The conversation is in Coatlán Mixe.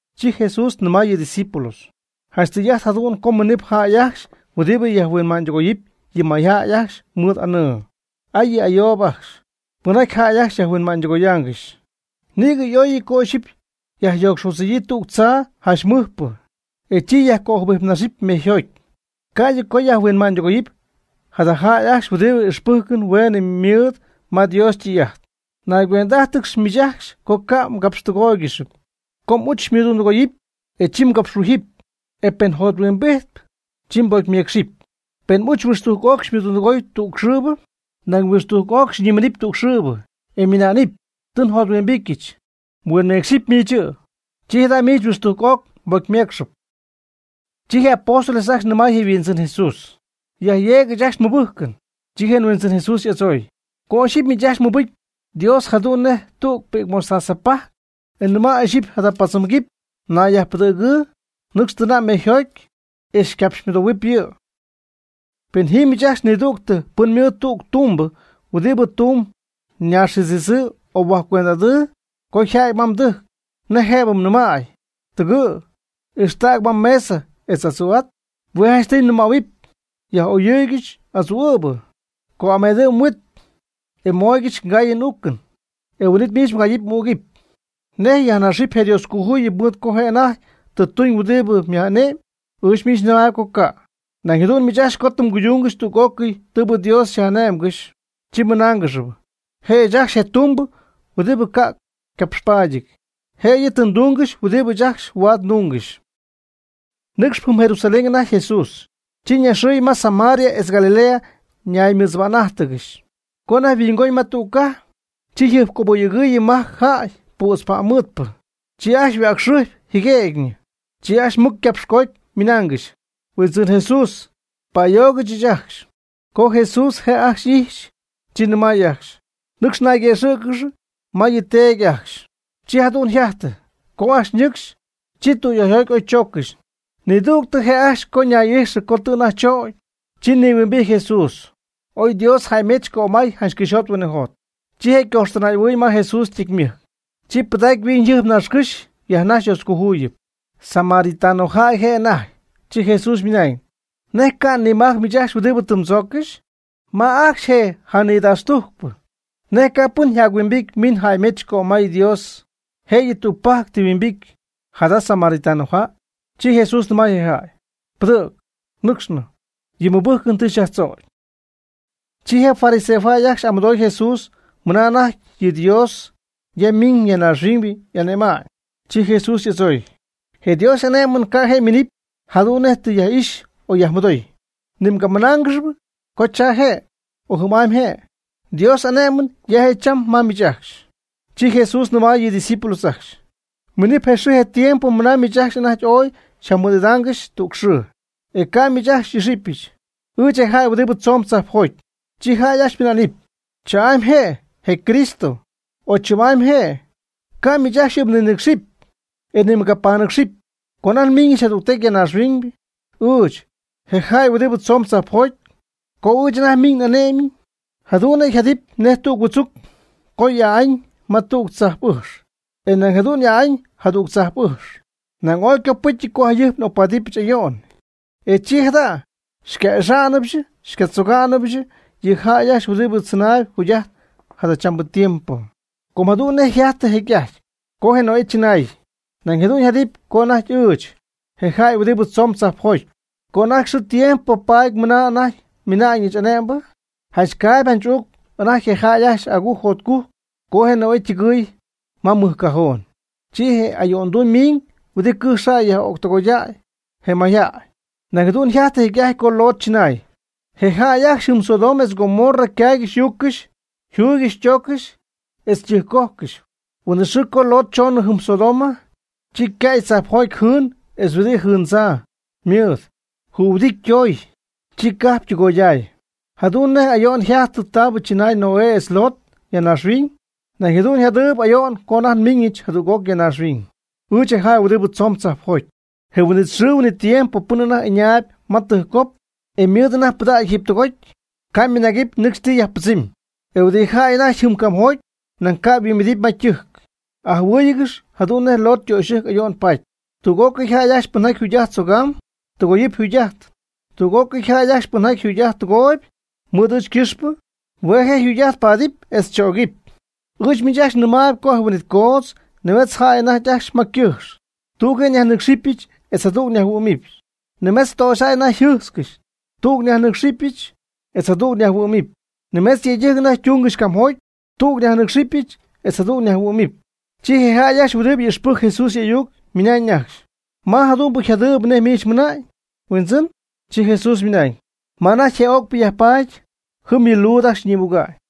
Chi Jesús nɨmay yɨ' ydiscípulos: ―Janch tɨy'ajt jadu'n co yminɨp jäy ajcxy huɨdi yajhuinma'ñydɨgoyɨp yɨ mayjäy ajcxy mɨɨd aanɨɨ. ¡Ay yɨ' ayoob ajcxy! pɨnjaty jäy ajcxy yajhuinma'ñydɨgoyaangɨxy. Nïgɨ y'óyɨty co ixyipy yajyo'cxodzɨ̈yii tüg tzaa janch mɨjpɨ, e chi yajcöjɨbijpnaxɨpy mejyjoty, ca'ydɨ co yajhuinma'ñydɨgoyɨpy jada jäy ajcxy huɨdibɨ ixpɨ́jcɨn hueenɨ mɨɨd ma Dios ytɨy'ajt. Naygüend'ájtɨgɨx miich ajcxy co ca' mgapxtɨgóoygɨxɨpy. Co m'uch xymɨdundɨgooyɨpy, e chi mgapxhuíjɨp, e pen jothuimbijt, chi mbocymeecxɨpy. Pen m'uch huixtujc'oc xymɨdundɨgooy tüg xɨɨbɨ, nañ huixtujc oc xyñimiiñ tüg xɨɨbɨ, e ymɨna'nɨpy: “Tɨ njothuimbityɨch”, huinmeecxɨpy miich yɨ', chi jada' miich huixtujc'oc mbocymeecxɨp. Chi je apóstoles ajcxy nɨmay je Huindzɨn Jesús: ―Yajyeeg ɨɨch ajcxy nmɨbɨ́jcɨn. Chi je Huindzɨn Jesús y'adzooy: ―Co ixyipy miich ajcxy mmɨbɨcy Dios jadu'n nej tüg pi'c mostaza pajc, e mnɨma' ixyipy jada paadzɨm quipy: “Nayyajpɨdɨ̈gɨɨ, nɨcx tɨna' mejyjoty, e xycapxymɨdohuɨp yɨ'.” Pen ji miich ajcxy nidüg pɨn ymɨɨd tüg ytumbɨ huɨdi tumb ñaaxjɨdzitzɨɨ o yhuaj cuend'aty, co yja'ty ma mdɨjc, ¿nej jëbɨ nɨmay: “Tɨgɨ', ixtäg ma mesa etz adzu'at?” Hue' janchtɨy mnɨmähuɨpy: “Yaj'oyɨ́ɨyɨgɨch n'adzuu'ɨ̈bɨ, co'amedɨ' mhuit, e xymooygɨch ngaayɨn n'uucɨn. E huin'it miich mgayɨpy m'ügɨpy.” ¿Nej yajnaxɨpy je' Dioscojuyip mɨɨd co je' anajty tɨ tuñ huɨdibɨ yaj'ane'my? Ɨɨch mɨnamb co ca'. Nañ jadu'n miich ajcxy co tɨ mguydungɨxy tüg'ócɨy tɨɨbɨ Dios xyaj'ane'mgɨxy, chi mmɨnáangɨxɨpy: “Je' ɨɨch ajcxy je tumbɨ huɨdibɨ ca'p ycapxpaadyɨty, jëyɨ tɨ ndúngɨxɨch huɨdibɨ ɨɨch ajcxy huaad ndungɨxy.” Nɨcxp jɨm Jerusalén anajty Jesús, chi ñaxɨy ma Samaria etz Galilea ñaymɨdzɨba'n'ájtɨgɨxy. Co anajty mɨhuingoñ tüg cajp, chi jɨjpcoyöyɨɨy majc jäy pützpa'mmɨɨdpɨ. Chi ajcxy yhuäcxɨjpy jɨguëgyñɨ. Chi ajcxy mɨc ycapxcoody ymɨnaangɨxy: ―Huindzɨn Jesús, pa'ayoog ɨɨch ajcxy. Co Jesús je' ajcxy ijxy, chi nɨmay ajcxy: ―Nɨcx nayguëxɨ̈cɨgɨx ma yɨ teedy ajcxy. Chi jadu'n yjajtɨ, co ajcxy ñɨcxy, chi tüyöyjoty oy chooccɨxy. Nidügtɨ je' ajcxy co ñay'ijxɨ co tɨ anajty chögy, chi nihuimbijty Jesús, ooy Dios jäymech cömay janch cɨxyjot huinɨjot. Chi je' ycojxtɨnay'ahuɨɨy ma Jesús ytecymɨjc, chi pɨdacpy yhuiñyjɨjp naaxcɨ́xy yajnaxy Dioscojuyipy. Samaritanojäy je' anajty. Chi Jesús ymɨnañ: ―¿Nej ca' nimajc miich ajcxy huɨdi tɨ mdzooccɨxy? ¿Ma ajcxy je' janidaxtujcpɨ? ¿Nej ca' pɨn jac yhuimbijty miiñ jäymedza'ñ cömaya'ñ Dios, jëyɨ tügpajc tɨ yhuimbity jada samaritanojäy? Chi Jesús nɨmay je jäy: ―Pɨdɨ̈g, nɨcxnɨ. Yɨ mmɨbɨ́jcɨn tɨ xyajtzögy. Chi je fariseojäy ajcxy y'amɨdooy Jesús mɨna anajty yɨ Dios ya miñ ya naaxhuiñ y'ane'ma'ñ. Chi Jesús y'adzooy: ―Je Dios y'ané'mɨn ca' je' yminɨpy jadu'n nej ti yaj'ixy o yajmɨdoy. Ni mgamɨnáangɨxɨpy co cha je' o jɨm'amy je'. Dios y'ané'mɨn ya je' cham ma miich ajcxy. Chi Jesús nɨmay yɨ' ydiscípulos ajcxy: ―Miim je xɨɨ je tiempo ma miich ajcxy anajty ooy xyjamɨɨd'idáangɨxɨch tüg xɨɨ, e ca' ɨɨch miich ajcxy xy'ixɨpy, ɨɨch je jäy huɨdi tzoon tzajpjoty. Chi jäy ajcxy ymɨná'nɨp: “Chaa'amy je', je Cristo”, o “Chɨm'amy je'.” Ca' miich ajcxy yɨ' mninɨ́cxcɨxɨpy, e ni mgabanɨ́cxcɨxɨpy. Co anajty nmiñɨch jadügtecy ya naaxhuiñ, ɨɨch, je jäy huɨdi tzoon tzajpjoty, co ɨɨch anajty nmɨmiñ n'ané'mɨn, jadu'n je' yjadɨpy nej huɨdzuc co y'aa'an ma tüg tzajp'ɨjx e nañ jadu'n y'aa'an jadüg tzajp'ɨjx. Nañ ooy ycopɨ́cyɨty co jayɨjp ocpáadɨbɨch ayo'n, e chi jada xyca'ixa'nɨbɨch xycatzoga'nɨbɨch yɨ jäy ajcxy huɨdi tzɨnaayb jugy'ajtp jadachambɨ tiempo. Com jadu'n nej yjajtɨ jecy'ajty, co je Noé chɨnaay, nañ jadu'n yjadɨpy co anajty ɨɨch, je jäy huɨdi tzoon tzajpjoty, co anajty nxɨɨ ndiempo paty mɨna anajty nmiñɨch ane'mbɨ. Janch caayb janch uucp anajty je jäy ajcxy agujc jotcujc co je Noé ytɨgɨɨy ma ymɨjcajoon. Chi je ayo'nduu ymiñ huɨdi cɨjx yaj'ögtɨgoydäy je mayjäy. Nañ jadu'n yjajtɨ jecy'ajty co Lot chɨnaay. Je jäy ajcxy jɨm Sodoma etz Gomorra ycaaygɨxy y'uuccɨxy yjuuygɨxy ytooccɨxy, etz ytɨjccojcɨxy. Huin'it xɨɨ co Lot choonɨ jɨm Sodoma, chi ycäy tzajpjoty jɨɨn etz huɨdi jɨndzaa mɨɨd conhuɨdity ytoy, chi cajp ytɨgoyday. Jadu'n nej ayo'n yjajtɨ taabɨ chɨnaay Noé etz Lot ya naaxhuiñ, nañ jadu'n yjadɨɨyb ayo'n co anajty nmiiñɨch jadüg'oc ya naaxhuiñ, ɨɨch je jäy huɨdi tzoon tzajpjoty. Je huin'it xɨɨ huin'it tiempo pɨn anajty ɨñaayb ma ytɨjccop, e ymɨɨd anajty ypɨdägy jiiby tɨgoty, ca' nimɨnagɨpy nɨcxy ti yajpɨdzɨmy, e huɨdi jäy anajty jɨm camjoty nañ ni ca' yhuimbidɨpy ma ytɨjc. Ajɨhuɨɨygɨx jadu'n nej Lot ytöxyɨjc ayo'n paty. Tüg'ócɨy jäy ajcxy pɨnjaty yjugy'ajt tzögam, tɨgoyɨpy yjugy'ajt. Tüg'ócɨy jäy ajcxy pɨnjaty yjugy'ajt tɨgooyb (mɨɨd ɨɨch ycɨxpɨ), hue' je' yjugy'ajt ypaadɨpy chögɨpy. Ɨɨch miich ajcxy nɨmaayb co je huin'it coodz nimetz jäy anajty ajcxy ma cɨjx, tüg yajnɨcxɨɨyb etz jadüg yajhuɨ'mɨɨyb. Nimetz töxyjäy anajty yjɨjtzcɨxy, tüg yajnɨcxɨɨyb, etz jadüg yajhuɨ'mɨɨyb. Nimetz yëydɨjc anajty ytungɨxy camjoty, tüg yajnɨcxɨɨyb etz jadüg yajhuɨ'mɨɨyb. Chi je jäy ajcxy huɨdi ixpɨjcp Jesús y'ayuc ymɨnañ ajcxy: ―¿Ma jadu'n yjadɨɨyb nej miich tɨ mɨna'ñ, Huindzɨn? Chi Jesús ymɨnañ: ―Ma anajty je ögpɨ yajpaady, jɨm yɨ luud ajcxy ñïmuga'ñ.